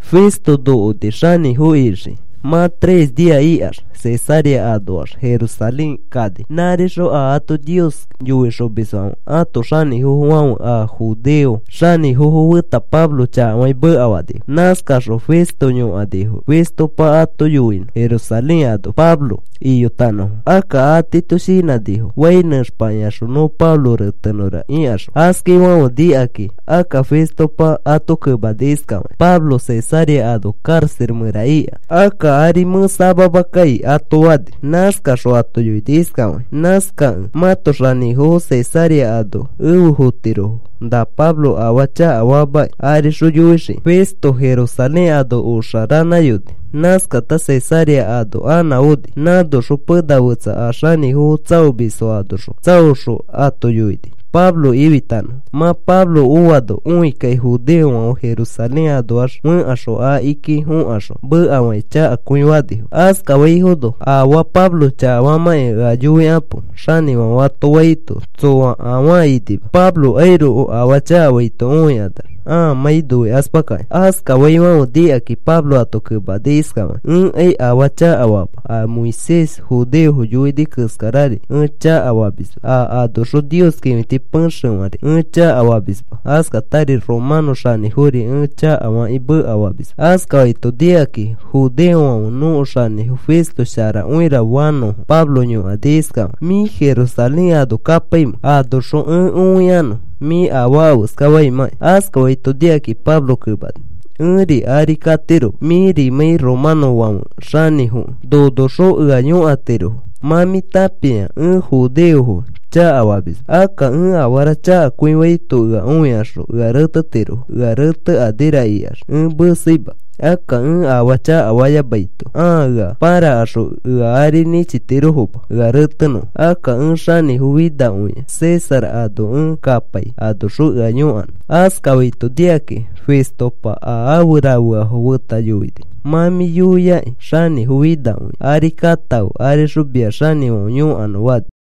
Festo nokoni xanĩfo ixiki. Mã tres nia ikax Cesarea anoax Jerusalén ari kani. Nãrixõ a ato Nios yoixomisfãfe ãto xanĩfofofãfe a judeo xanĩfofo feta Pablo chakafakĩ mekafanifo. Nãskaxõ Festo yõkanifo Festopa ato yoinõ Jerusalén ano Pablo iyotanõfo. Akka atiito shinãnifo fai nẽxpakĩaxõ nõ Pablo retenõra ikaxõ. Askafaifãfe nikakĩ akka Festopa ato kemani iskafakĩ: “Pablo Cesarea ano karaxa mẽra ika. Akka ari mẽ samama kai,” ato fani. Nãskaxõ ato yoini iskafakĩ: “Nãskakẽ mãto xanĩfofo Cesarea ano efe fotirofo, na Pablo afaa chakafaamakĩ arixõ yoixikakĩ.” Festo Jerusalén ano oxa ranãyoni. Nãskata Cesarea ano anã oni. Nãnoxõ pena fetsa a xanĩfofo tsaomisfo anoxõ tsaoxõ ato yoini Pablo ifitanõfo. Mã Pablo oano õikakĩ, judeofãfe Jerusalén anoax fẽkaxõ, akiki fokaxõ mekafakĩ chakakõi fanifo. Askafaifono, “Afaa Pablo chakafamãkĩ ea yoikapo,” xanĩfãfe ato faito, tsoa afaa inima Pablokairoko afaa chakafaito õikanax ãamãi noikaspakakĩ. Askafaifãfe nikakĩ Pablo ato kemani iskafakĩ: “Ẽkai afaa chakafama, a Moisés judeofo yoini keskarari ẽ chakafamisma, a anoxõ Nios kĩfiti pexefãri ẽ chakafamisma, askatari romanõ xanĩfori ẽ chakafakĩ mekafamisma.” Askafaito nikakĩ judeofãfe nõko xanĩfo Festo sharakõira fanõfo Pablo yõkani iskafakĩ: “¿Mĩ Jerusalén ano kapaimẽ? Anoxõ ẽ õikanõ mĩ afaa afeska famãki.” Askafaito nikakĩ Pablo kemani: “Ẽ ari katiroma mĩrimãi romanõfãfe xanĩfokẽ nonoxõ ea yõkatirofo. Mã mĩ tãpia, ẽ judeofo chakafamisma. Akka ẽ afara chakakõifaito ea õikaxõ ea retetirofo. Ea retekanira ikax ẽ meseima. Akka ẽ afaa chakafayamaito ãa ea pãrakaxõ ea ari nĩchitirofoma ea retenõfo. Akka ẽ xanĩfo finakõia César ano ẽ kapai anoxõ ea yõkanõ.” Askafaito nikakĩ Festopa a afe rafeafo feta yoini: “Mã mĩ yoiaki xanĩfo finakõi ari katãfe arixõ mia xanĩfãfe yõkanõ,” fani.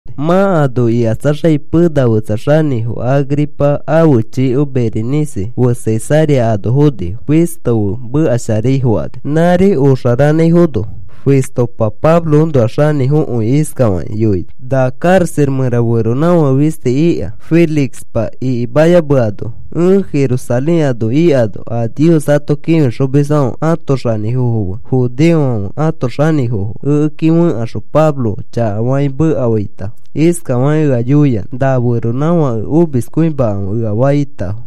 Mã ano ikatsaxakĩ pena fetsa xanĩfo Agripa ãfe chiko Berenice fe Cesarea ano fonifo Festo fe mekasharai fokani. Nãri oxa ranãifono, Festopa Pabloõnoa xanĩfokõi iskafakĩ yoini: “Na karaxa mẽra feronãfake fisti ika Félixpa ikimayameano. Ẽ Jerusalén ano ikano a Nios ato kĩfixomisfãfe ãto xanĩfofo fe judeofãfe ãto xanĩfofo ekeki fẽkaxõ Pablo chakafakĩ mekafaitafo iskafakĩ ea yoiyanã na feronãfake omiskõimafe ea faitafo.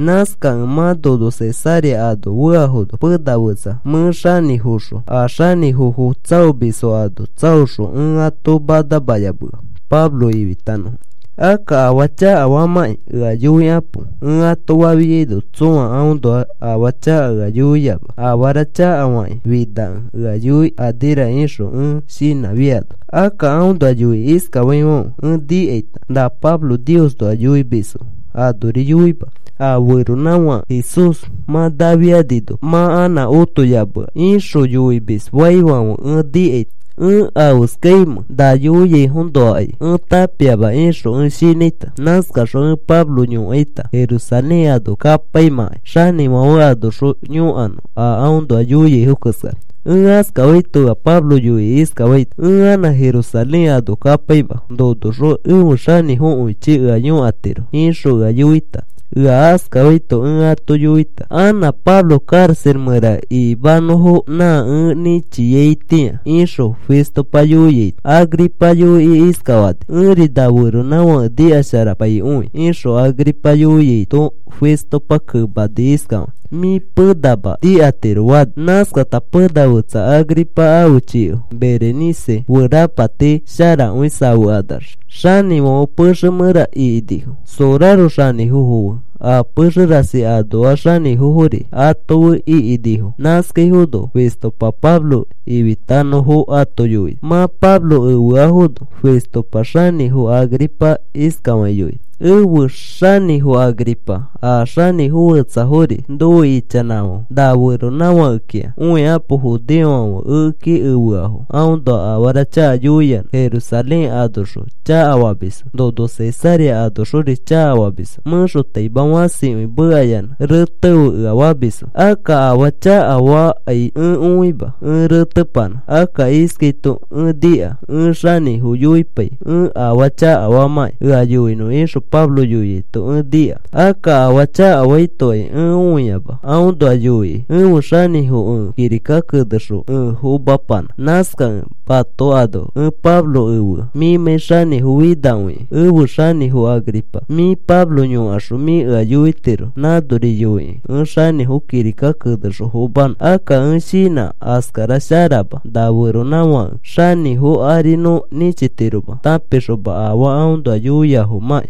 Nãskakẽ mã nono Cesarea ano feafono, pena fetsa mẽ xanĩfoxõ a xanĩfofo tsaomisfo ano tsaoxõ, ẽ ato manamayamea Pablo ifitanõfo. Akka afaa chakafaamakĩ ea yoikapo ẽ ato fafiaino, tsõa aõnoa afaa chaka ea yoiama. Afara chakafakĩ finakẽ ea yoikanira ixõ ẽ shinãfiaino. Akka aõnoa yoikĩ iskafaifãfe ẽ nikaita: ‘Na Pablo Niosnoa yoimisfo anori yoima, a feronãfake Jesús mã nafianino, mã anã otoyamea,’ ixõ yoimisfaifãfe ẽ nikaita. Ẽ afeskaimẽ na yoiaifoõnoakai ẽ tãpiama ixõ ẽ shinãita. Nãskaxõ ẽ Pablo yõkaita, Jerusalén ano kapaimãkai xanĩfãfe anoxõ yõkanõ a aõnoa yoiaifo keskara. “Ẽ askafaito ea Pablo yoikĩ iskafaita: ‘Ẽ anã Jerusalén ano kapaima. Nonoxõ ẽfe xanĩfokõichi ea yõkatiro,’ ixõ ea yoita. Ea askafaito ẽ ato yoita anã Pablo karaxa mẽra ikimanõfo, nã ẽ nĩchiaitĩa,” ixõ Festopa yoiaito, Agripa yoikĩ iskafani: “Ẽri na feronãfake nikasharapaikõi,” ixõ Agripa yoiaito, Festopa kemani iskafakĩ: “Mĩ penama nikatiro,” fani. Nãskata pena fetsa Agripa ãfe chiko Berenice fe rapati sharakõi safekanax xanĩfãfe pexe mẽra ikinifo. Soraro xanĩfofo fe a pexe rasi anoa xanĩfofori ato fe ikinifo. Nãskaifono Festopa Pablo ifitanõfo ato yoini. Mã Pablo efeafono Festopa xanĩfo Agripa iskafakĩ yoini: “Efe xanĩfo Agripa, a xanĩfo fetsafori nofe ichanãfãfe na feronãfakekĩa õikapo. Judeofãfe ekeki efeafo aõnoa afara chaka yoiyanã. Jerusalén anoxõ chakafamisfo, nono Cesarea anoxori chakafamisfo. Mẽxotaima fãsikõi mekayanã retefe ea famisfo. Akka afaa chakafakai ẽ õima ẽ retepanã. Akka iskaito ẽ nika: ‘Ẽ xanĩfo yoipai ẽ afaa chakafamãkĩ ea yoinõ,’ ixõ Pablo yoiaito ẽ nika. Akka afaa chakafaitokai ẽ õiama, aõnoa yoikĩ ẽfe xanĩfo ẽ kirika kenexõ ẽ fomapanã. Nãskakẽ mato ano ẽ Pablo efea mĩmãi xanĩfo finakõikẽ. Efe xanĩfo Agripa, mĩ Pablo yõkaxõ mĩ ea yoitiro nãnori yoikĩ ẽ xanĩfo kirika kenexõ fomanõ. Akka ẽ shinã askara sharama na feronãfake xanĩfo ari nõ nĩchitiroma tãpixoma afaa aõnoa yoiafomãki.”